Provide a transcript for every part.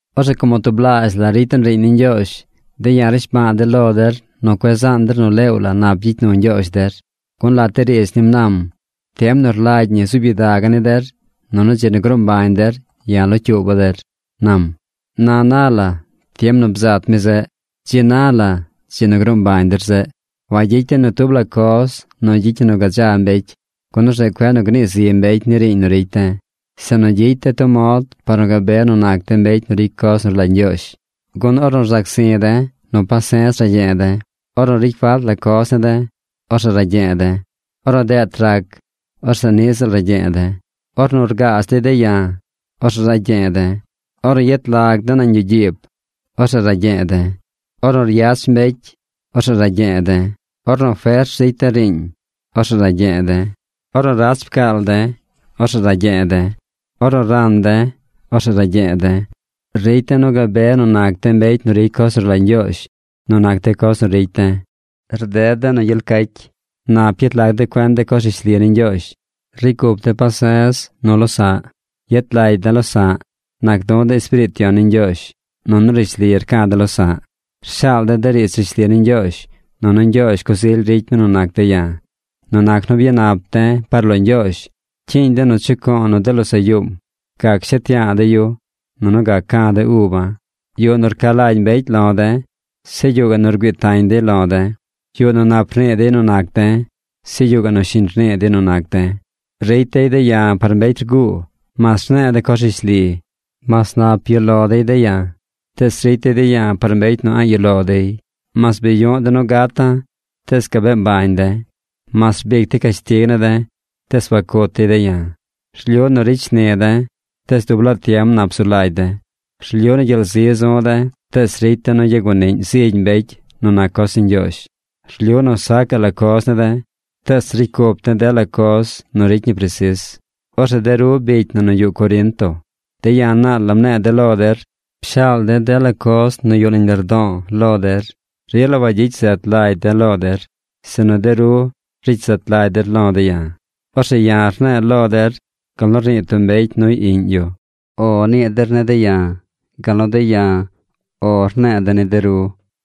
Orzeꞌ como tublaazh la ricy den riiñ ni Ñgyoozh, de̱ ya̱ rnishba̱a̱ de̱ lo der nu cueꞌ zaan der nu leew la nap gyicy nu Ñgyoozh der. Gun lat de riidz nim nam: Tiem nu rlagy ñi zuub gyidaga̱ ni der. Nunu dzi nu gruu mbañ der, ya̱ locyuuba̱ der, nam. Na na la, tiem nu bzat mi zeꞌ. ¡Dzi na la dzi nu gruu mbañ der zeꞌ! Wagyicy de̱ ni tub la coz nu gyicy ñi nu gadza mbecy, gun orzeꞌ cueꞌ nu gnii zi mbecy ni riiñ nu ricy de̱, sinu gyicy de̱ tub mod par nu gabe nu nac de̱ mbecy nu ricy coz nu rlagy Ñgyoozh. Gun ornu rzac zi̱ de̱, nu pase̱z ragye̱e̱ de̱. Ornu ricy falt la coz ne̱ de̱, orzeꞌ ragye̱e̱ de̱. Ornu deet rac, orzeꞌ niꞌ ziꞌl ragye̱e̱ de̱. Ornu rgaaz dey de̱ ya̱, orzeꞌ ragye̱e̱ de̱. Ornu yet lag de̱ nañ yuꞌ gyiib, orzeꞌ ragye̱e̱ de̱. Ornu ryach mbecy, orzeꞌ ragye̱e̱ de̱. Ornu fers ricy de̱ riiñ, orzeꞌ ragye̱e̱ de̱. Ornu rach pcaal de̱, orzeꞌ ragye̱e̱ de̱. Ornu ran de̱, orzeꞌ ragye̱e̱ de̱. Ricy de̱ nu gabe nu nac de̱ mbecy nu ricy coz nu rlagy Ñgyoozh nu nac de coz nu ricy de̱. Rded de̱ nu gyel cacy. Nap yet lag de̱ cuen de coz rishli ni Ñgyoozh. Ricy cup de̱ pase̱z nu losa̱ꞌ. Yet lagy de̱ losa̱ꞌ. Nac du̱ de̱ Espiriit Yon ni Ñgyoozh. Nunu rishli rca̱ de̱ losa̱ꞌ. Rshaal de̱ de riidz rishli ni Ñgyoozh. Nunu Ñgyoozh coz ily ricy mi nu nac de̱ ya̱. Nu nac nu byanap de̱ par lo Ñgyoozh, cyiiñ de̱ nu chuco̱o̱ nu de losaꞌ yuum. Gac shet ya̱a̱ de̱ yu. Nunu gac ca̱ de̱ uba̱. Yuꞌ nu rca lagy mbecy lo de̱. Zeꞌ yuꞌ gaꞌ nu rgüii tañ dey lo de̱. Yuꞌ nu nap rnii dey nu nac de̱. Zeꞌ yuꞌ gaꞌ nu shiñ rnii dey nu nac de̱. Ricy dey de̱ ya̱ par mbecy rguu, mas rne̱e̱ de̱ coz rishli. Mas nap yuꞌ lo dey de̱ ya̱, tees ricy dey de̱ ya̱ par mbecy nu a̱ꞌ yuꞌ lo dey. Mas bi yuꞌ de̱ nu gata̱, tees gabee mbañ de̱. Mas rbic dey cashtig ne̱ de̱, tees wacut dey de̱ ya̱. Rlyu nu ricy shni de̱, tees dub laa tiem nap zu lagy de̱. Rlyu nu gyel zi zu̱ de̱, tees ricy de̱ nu yaguaniꞌñ zig mbecy nu nac coz ni Ñgyoozh. Rlyu nu sacaꞌ la coz ne̱ de̱, tees ricy cup de̱ dela coz nu ricy ñi presis. Orzeꞌ de ru bicy na nu yuꞌ Corinto, de̱ ya̱ naal la mne̱e̱ lo der. Pshaal de̱ dela coz nu yuꞌ nañ lardo̱o̱ lo der. Rila wagyicy zet lagy de̱ lo der, sinu de ru ricy zet lagy der lo̱ de̱ ya̱. Orzeꞌ ya̱ rne̱e̱ lo der gal nu rnii tub mbecy nuy iꞌñ yu. “O” nii der ne̱ de̱ ya̱, gal nu de̱ ya̱ “O” ne̱e̱ de̱ ni de ru.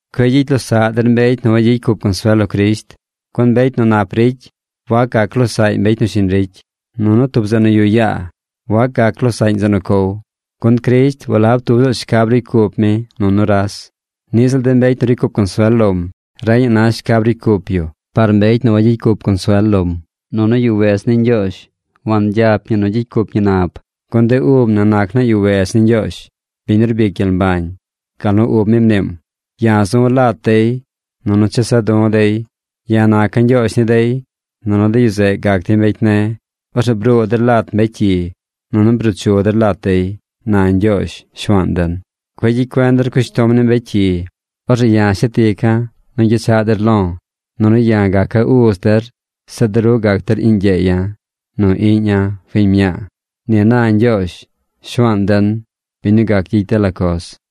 Cueꞌ gyicy losaꞌ der mbecy nu wayicy cup consuel lo Crisht. Gun mbecy nu nap ricy, wac gac losaꞌy mbecy nu shiñ ricy. Nunu tub zeꞌ nu yuꞌ yaa wac gac losaꞌñ zeꞌ nu cow. Gun Crisht walab tub ziꞌl shcab ricy cup mi nu nuras. Niꞌ ziꞌl de mbecy nu ricy cup consuel lom reñaꞌ na shcab ricy cup yu par mbecy nu a̱ꞌ ricy cup consuel lom. Nunu yuꞌ wedz ni Ñgyoozh wangyap ñi nu gyicy cup ñi nab. Gun de ub na nac naa yuꞌ wedz ni Ñgyoozh, biñ nu rbic gyel mbañ. Gal nu ub mi mniim: Ya̱ zu̱ lat dey, nunu chesa̱ du̱ dey. Ya̱ naca̱ Ñgyoozh ni dey. Nunu de yu zeꞌ gac dey mbecy ne̱. Orzeꞌ bruu der lat mbecy cyi, nunu bruu chu der lat dey, na Ñgyoozh, Shuaan den. Cueꞌ gyicy cuen der cushtom ni mbecy cyi. Orzeꞌ ya shet ica̱ nu gyechaꞌ der lo̱. Nunu ya̱ gaca̱ uz der. Zeꞌ de ru gac der iꞌñ gyeeya̱ nu iꞌñ fiñ mña̱a̱. Ni na Ñgyoozh Shuaan den, biñ nu gac gyicy dela coz.